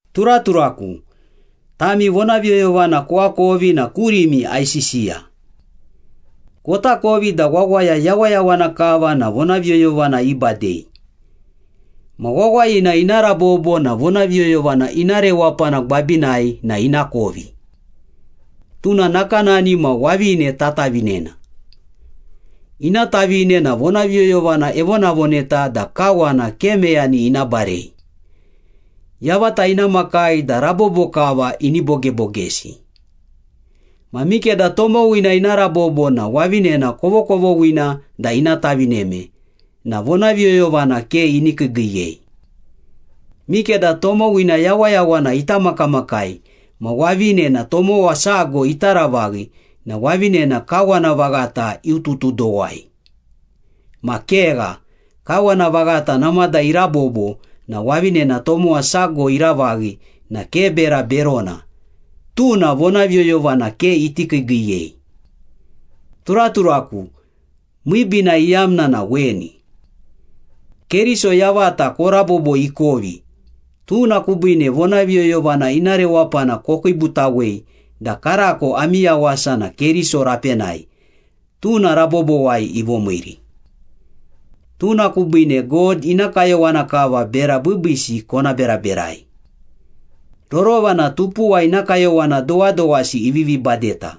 Turaturaku, tami vonaviyoyovana koakovi na kurimi aisisiya. Kotakovi da wawaya yawayawana kava na vonaviyoyovana ibadei. Ma wawayina ina rabobo na vonaviyoyovana ina rewapana gwabinai na ina kovi. Tuna nakanani ma wavine tatavinena. Ina tavine na vonaviyoyovana evonavoneta da kawana ke meyani ina barei. Yavata ina makai da rabobo kava ini bogebogesi. Ma mikeda tomowina ina rabobo na wavinena kovokovoghina da ina tavineme na vonaviyoyovana ke ini kiigiiyei. Mikeda tomowina yawayawana ita makamakai ma wavinena tomowa sago ita ravaghi na wavinena kawana vaghata iututudowai. Ma kegha, kawana vaghata namada irabobo na wavinena tomowa sago iravaghi na ke bera berona, tuna vonaviyoyovana ke iti kiigiiyei. Turaturaku, miibiina iyamna na weni. Keriso yavata korabobo ikovi, tuna kubiine vonaviyoyovana ina rewapana kokiibutawei da karako ami yawasa na Keriso rapenai, tuna rabobowai ivomiiri. Tuna kubiine God ina kayowana kava bera biibiisi kona beraberai. Rorova na tupuwa ina kayowana dowadowasi ivivi badeta.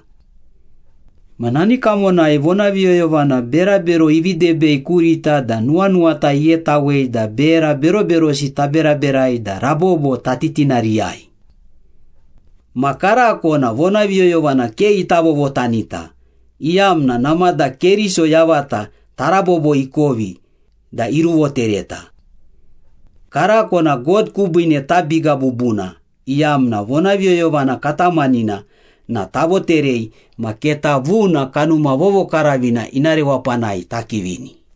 Ma nani kamonai vonaviyoyovana berabero ivi debei kurita da nuwanuwata ighetawei da bera beroberosi taberaberai da rabobo tatitinariyai. Ma karako na vonaviyoyovana ke ita vovotanita, iyamna namada Keriso yavata tarabobo ikovi da iruvotereta. Karako na God kubiine tabiga bubuna, iyamna vonaviyoyovana katamanina na tavoterei ma keta vuna Kanuma Vovokaravina ina rewapanai takivini.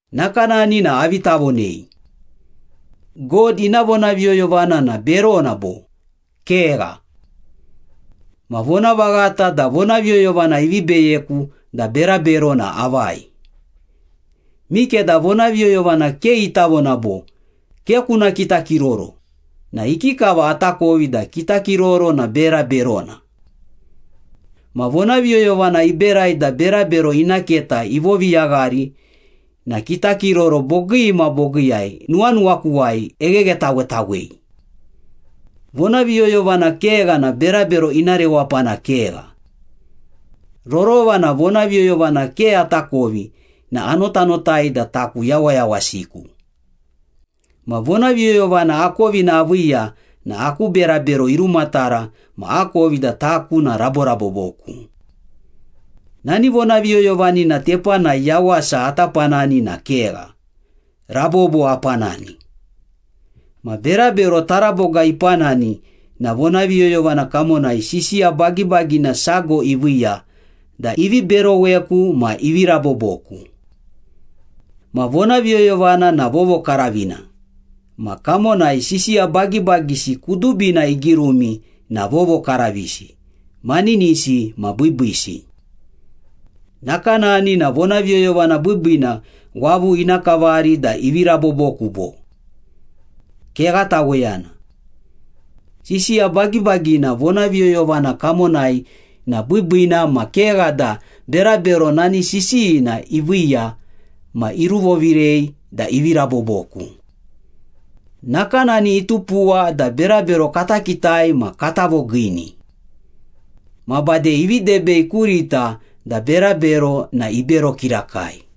Nakanani na avi tavonei? God ina vonaviyoyovana na berona bo? Kegha. Ma vonavaghata da vonaviyoyovana ivi beyeku da berabero na avai. Mikeda vonaviyoyovana ke ita vona bo, “Ke kuna kitakiroro” na ikikava atakovi da kitakiroro na bera berona? Ma vonaviyoyovana iberai da berabero ina keta ivoviyaghari na kitakiroro bogii ma bogiiyai nuwanuwakuwai egheghetawetawei. Vonaviyoyovana kegha na berabero ina rewapana kegha. Rorova na vonaviyoyovana ke atakovi na anotanotai da taku yawayawasiku. Ma vonaviyoyovana akovina aviiya na aku berabero irumatara ma akovi da taku na raboraboboku. Nani vonaviyoyovanina tepanai yawasa ata panani na kegha, rabobo apanani. Ma berabero taraboga ipanani na vonaviyoyovana kamonai sisiya bagibagina sago iviiya da ivi beroweku ma ivi raboboku. Ma vonaviyoyovana na vovokaravina ma kamonai sisiya bagibagisi kudubina igirumi na vovokaravisi, maninisi ma biibiisi. Nakanani na vonaviyoyovana biibiina wavu ina kavari da ivi raboboku, bo? Kegha taweyana! Sisiya bagibagina vonaviyoyovana kamonai na biibiina ma kegha da berabero nani sisiyina iviiya ma iruvovirei da ivi raboboku. Nakanani itupuwa da berabero kata kitai ma kata vogiini. Ma bade ivi debei kurita da berabero na ibero kirakai.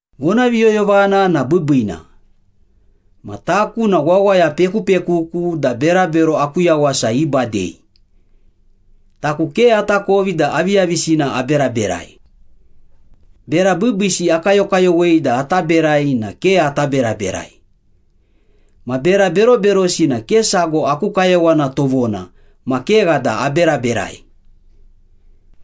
Vonaviyoyovana na biibiina. Ma taku na wawaya pekupekuku da berabero aku yawasa ibadei. Taku ke atakovi da aviyavisina aberaberai. Bera biibiisi akayokayowei da ata berai na ke ata beraberai. Ma bera beroberosi na ke sago aku kayowana tovona ma kegha da aberaberai.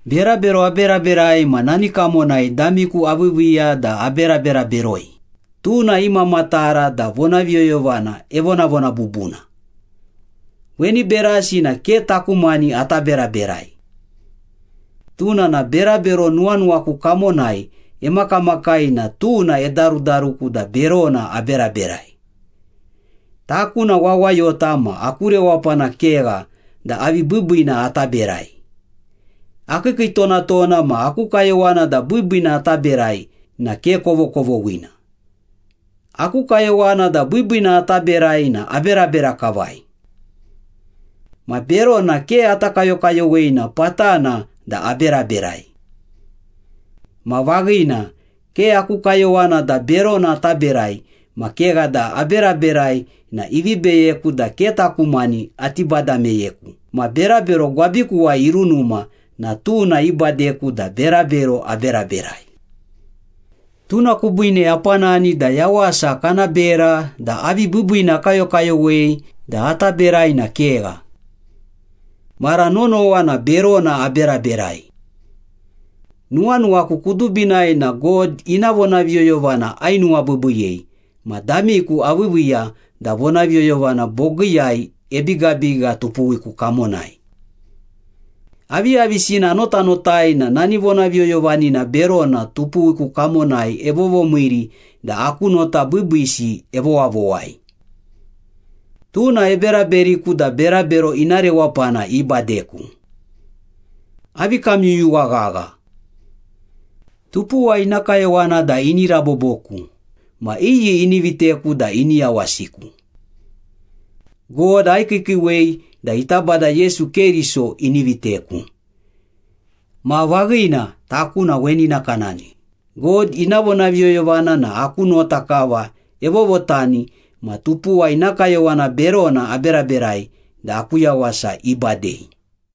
Berabero aberaberai ma nani kamonai damiku aviiviiya da aberabera beroi, tuna imamatara da vonaviyoyovana evonavona bubuna. Weni berasi na ke taku mani ata beraberai. Tuna na berabero nuwanuwaku kamonai emakamakai na tuna edarudaruku da berona aberaberai. Taku na wawayota ma aku rewapana kegha da avi biibiina ata berai. Akiikiitonatona ma aku kayowana da biibiina ata berai na ke kovokovoghina. Aku kayowana da biibiina ata berai na aberabera kavai. Ma berona ke ata kayokayowei na patana da aberaberai. Ma vaghina, ke aku kayowana da berona ata berai ma kegha da aberaberai na ivi beyeku da ke taku mani ati bada meyeku ma berabero gwabikuwai irunuma na tuna ibadeku da berabero aberaberai. Tuna kubiine apanani da yawasa kana bera da avi biibiina akayokayowei da ata berai na kegha. Mara nonowa na berona aberaberai. Nuwanuwaku kudubinai na God ina vonaviyoyovana ainuwabiibiiyei, ma damiku aviiviiya da vonaviyoyovana bogiiyai ebigabiga tupuwiku kamonai. Aviyavisina anotanotai na nani vonaviyoyovanina berona tupuwiku kamonai evovomiiri da aku nota biibiisi evowavowai. Tuna eberaberiku da berabero ina rewapana ibadeku. Avi kamyuyuwa ghagha. Tupuwa ina kayowana da ini raboboku ma iyi ini viteku da ini yawasiku? God aikiikiiwei da ita Bada Yesu Keriso ini viteku. Taku na vaghina weni nakanani, God ina vonaviyoyovana na aku nota kava evovotani ma tupuwa ina kayowana berona aberaberai da aku yawasa ibadei.